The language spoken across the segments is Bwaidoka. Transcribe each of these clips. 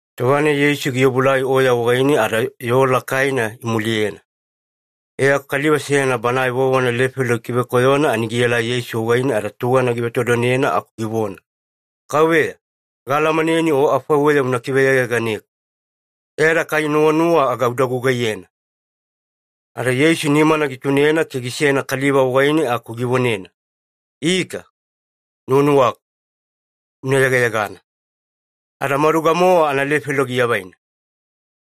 Tova-nai Yeisu giobuelai oya wagaine ada yoo lakaina imuliyena. E aku kaliva seyana banae vovona lefelo gikivekoyona, ani gielai Yeisu wagaine ada tugana givetodonena aku givona, “Kauveya, gaalamanena O afaiweya una kiveyegayeganeku. E ada kai nuwanuwa aga uda gugaiyena.” Ada Yeisu nimana gitunena ke gisena kaliva wagaine aku givonena, “Ika, nuwanuwaku. Una yegayegana.” Ada maduga-mowa analefelo giavaina.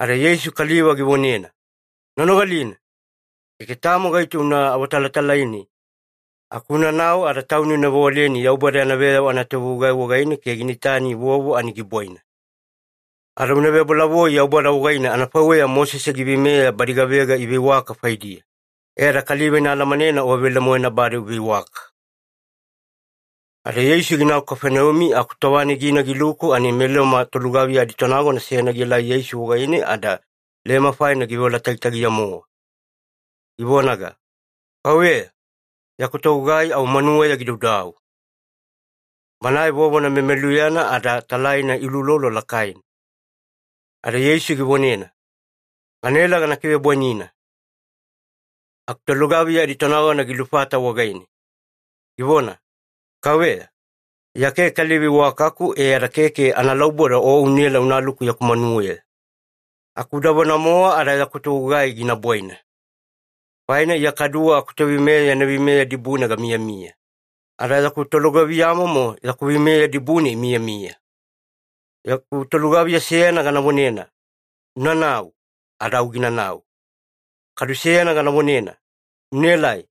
Ada Yeisu kaliva givonena, “Una nogalina. Keke tamo gaito una awatalatalaine, aku unanau ada tauni una vewaleni Yaubada yana veyavo anatovegugai wagaine ke gina itani vovo ani gibwaina. Ada una vebolavoi Yaubada wagaine anafaiweya Mosese giveimeya badi gavega iveiwaka faidiya, e ada kaliva ina alamanena o velemoena bade uveiwaka.” Ada Yeisu ginau Kafaneumi, aku tova-nai gina giluku ani meLoma tolugaviya aditonagona seyana gielai Yeisu wagaine ada lema faina giveola tagitagiya-mowa. Givonaga, “Kauveya, yaku togugai au manuweya gidaudau. Banae vovona memeluyana ada talaina iuloulolo lakaina.” Ada Yeisu givonena, “Ganaela gana kivebwainina.” Aku tolugaviya aditonagona gilufata wagaine, givona, “Kauveya, Iya keke kaliva iwakaku e ada keke analauboda o unaela unaluku yaku manuweya. Aku udavona-mowa ada yaku togugai gina bwaina. Faina Iya kaduwe akutoveimeya yana veimeya dibune gamiyamiya, ada yaku tolugaviyamomo yaku veimeya dibune imiyamiya. Yaku tolugaviya seyana gana vonena, ‘Unanau.’ Ada au ginanau. Kadu seyana gana vonena, ‘Unaelai.’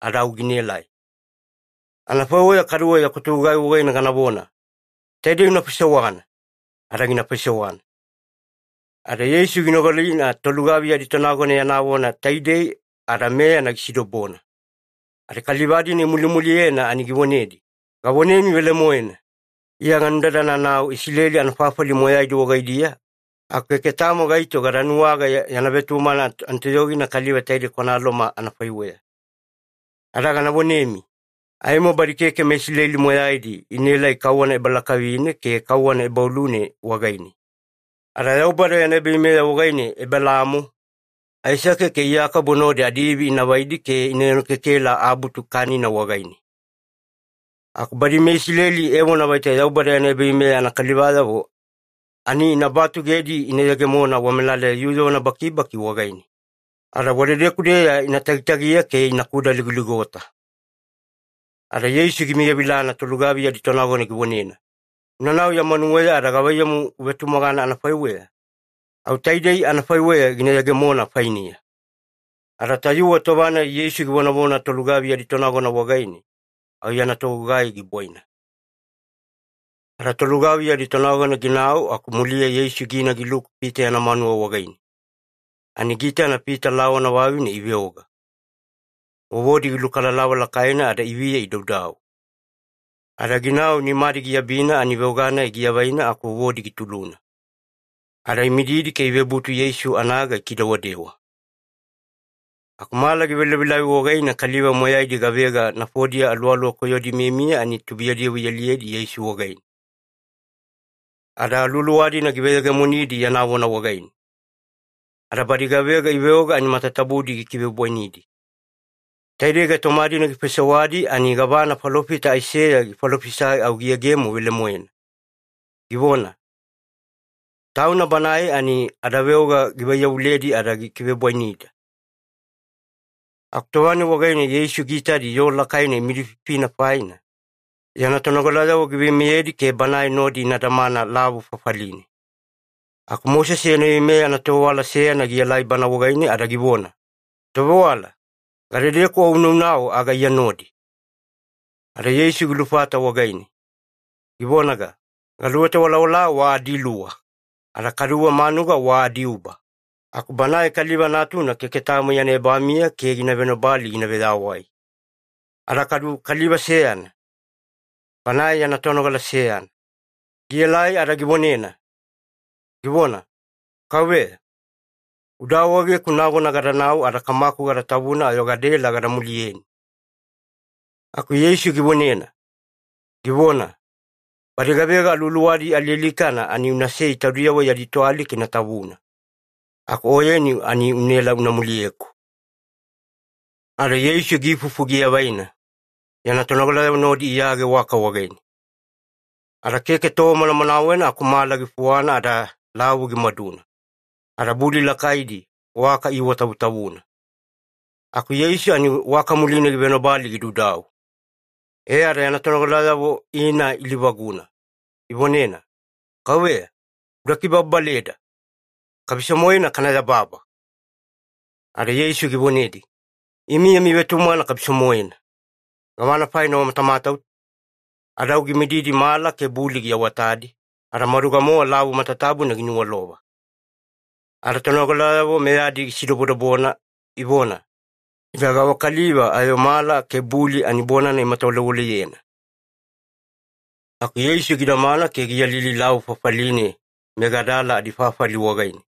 Ada au ginaelai. Anafaiweya kaduwe yaku togugai wagaine ganavona, ‘Taidei una faisewana.’ Ada gina faisewana.” Ada Yeisu ginogalina tolugaviya aditonagona yana vona taidei ada meyana gisidobona, ada kaliva-dina imulimuliyena ani givonedi, “Gavonemi velemoena, Iya ganudadananau Isileli anafafali moyaidi wagaidiya, aku keke tamo gaito gada nuwaga yana vetumagana anatoyogina kaliva taide kwana Loma anafaiweya. Ada gana vonemi, aimo badi keke meIsileli moyaidi inaelai kauwana ebalakavine ke kauwana ebaoluna wagaine, ada Yaubada yana ebaveimeya wagaine Ebelaamo, Aisake, ke Iyakobo nodi adiivi ina vaidi ke ina enokekela abutu kanina wagaine. Aku badi meIsileli evona vaita Yaubada yana ebaveimeya anakalivayavo, ani ina batugedi ina yegemona wamelaleya yuyuvana bakibaki wagaine, ada wadedeku-deya ina tagitagiya ke ina kudaligoligota.” Ada Yeisu gimiyavilana tolugaviya aditonagona givonena, “Unanau ya manuweya ada gavaiyamu uvetumagana anafaiweya, au taidei anafaiweya gina yegemona fainiya.” Ada tayuwe tova-nai Yeisu givonavona tolugaviya aditonagona wagaine, au yana togugai gibwaina. Ada tolugaviya aditonagona ginau, aku muliya Yeisu gina giluku Pita yana manuwa wagaine, ani giitana Pita lawana vavine iveoga, vovodi gilukalalava lakaina ada iviya idaudau. Ada ginau nimadi giabina ani veoga-nai giavaina aku vovodi gituluna. Ada imididi ke ivebutu Yeisu anaga ikidewadewa. Aku mala givelavilavi wagaine, kaliva moyaidi gavega nafodiya aluwaluwa koyodi imiyamiya ani tubuiyadiyavo ialiyedi Yeisu wagaine. Ada aluwaluwa-dina giveyegemonidi yana vona wagaine, ada badi gavega iveoga ani matatabudi gikivebwainidi. Taidei gaitoma-dina gifaisewadi ani gavana falofita Aiseya gifalofisai au giyegemo velemoena, givona, “Tauna Banae ani adaveoga givaiyavuledi ada gikivebwainida.” Aku tova-nai wagaine Yeisu giitadi yoo lakaina imidififina faina, yana tonogalayavo giveimeyedi ke Banae nodi ina damana lavu fafaline. Aku Mosese yana veimeya anatovewala seyana gielai Banae wagaine ada givona, “Tovewala, gadedeku O una naunau aga Iya nodi.” Ada Yeisu gilufata wagaine, givonaga, “Galuweta walawala wa adiluwa, ada kaduwe manuga wa adiuba, aku Banae Kaliva Natuna keke tamo yana ebamiya ke gina venobali gina veyawai.” Ada kadu kaliva seyana, banae yana tonogala seyana, gielai ada givonena, givona, “Kauveya, uda awaegeku nagona gadanau ada kamaku gada tavuna ayo gadaela gada muliyeni.” Aku Yeisu givonena, givona, “Badi gavega aluwaluwadi alialikana ani unasei taudiyavo yadi toalika ina tavuna. Aku oyeni ani unaela una muliyeku.” Ada Yeisu giifufu giavaina, yana tonogalayavo nodi iyage waka wagaine. Ada keke tova manamanawena aku mala gifuwana ada lavu gimaduna, ada buli lakaidi waka iiwatavutavuna. Aku Yeisu ani waka muline givenobali gidaudau. E ada yana tonogalayavo ina ilivaguna, ivonena, “Kauveya, uda kibababaleda! Kabiso-moena kana yababa!” Ada Yeisu givonedi, “Imi yami vetumagana kabiso-moena. Gavana faina wamatauta?” Ada au gimididi mala ke buli giawatadi, ada maduga-mowa lavu matatabuna giniwalova. Ada tonogalayavo meyadi gisidobodobona, ivona, “Ida gavakaliva ayo mala ke buli ani bonana imatawalewaleyena!” Aku Yeisu gidamana ke giyalili lavu fafaline meGadala adifafali wagaine,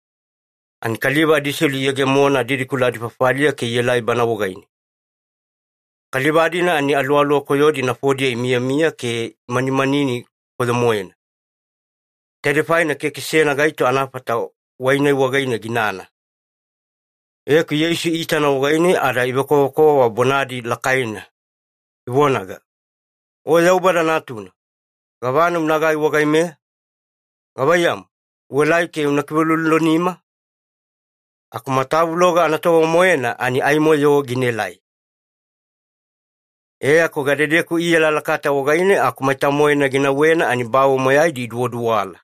ani kaliva adiselu iyegemona didikula adifafaliya ke ielai Bana wagaine. Kaliva-dina ani aluwaluwa koyodi nafodiya imiyamiya ke imanimanini koyo-moena. Taidei faina keke seyana gaito anafata wai-nai wagaine ginana. E aku Yeisu iitana wagaine ada ivekovakova bonadi lakaina, ivonaga, “O Yaubada Natuna, gavana unagai wagaimeya? Gavaiyamu, uelai ke una kiveuloulolonima? Aku matavuloga anatova-moena ani aimo-yo ginaelai.” E aku gadedeku iyalalakata wagaine aku maita-moena ginauwena, ani bawe moyaidi iduwaduwala.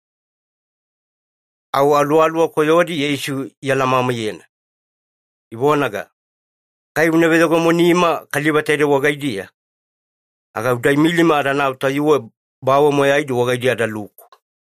Au aluwaluwa koyodi Yeisu ialamamaiyena, ivonaga, “Kai una veyegemonema kaliva taidei wagaidiya, aga uda imilima adanau tayuwe bawe moyaidi wagaidiya adaluku.”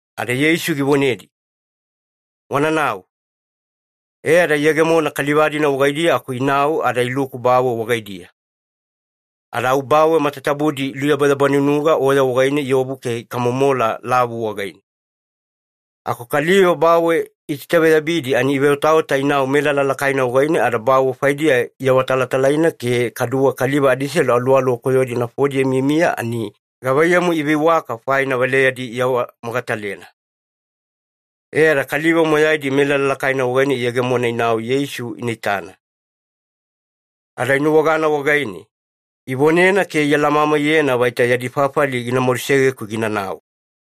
Ada Yeisu givonedi, “Wananau.” E ada iyegemona kaliva-dina wagaidiya aku inau ada iluku bawe wagaidiya. Ada au bawe matatabudi iluyabayabanunuga oya wagaine iobu ke ikamomola lavu wagaine. Aku kaliva bawe itaitaveyabidi, ani iveotaota inau melala lakaina wagaine ada bawe faidiya iawatalatalaina ke kaduwe kaliva adiselu aluwaluwa koyodi nafodiya imiyamiya ani gavaiyamu iveiwaka faina valeyadi iawamogatalena. E ada kaliva moyaidi melala lakaina wagaine iyegemona inau Yeisu ina itana. Ada inuwagana wagaine, ivonena ke ialamamaiyena vaita yadi fafali gina madusegeku ginanau.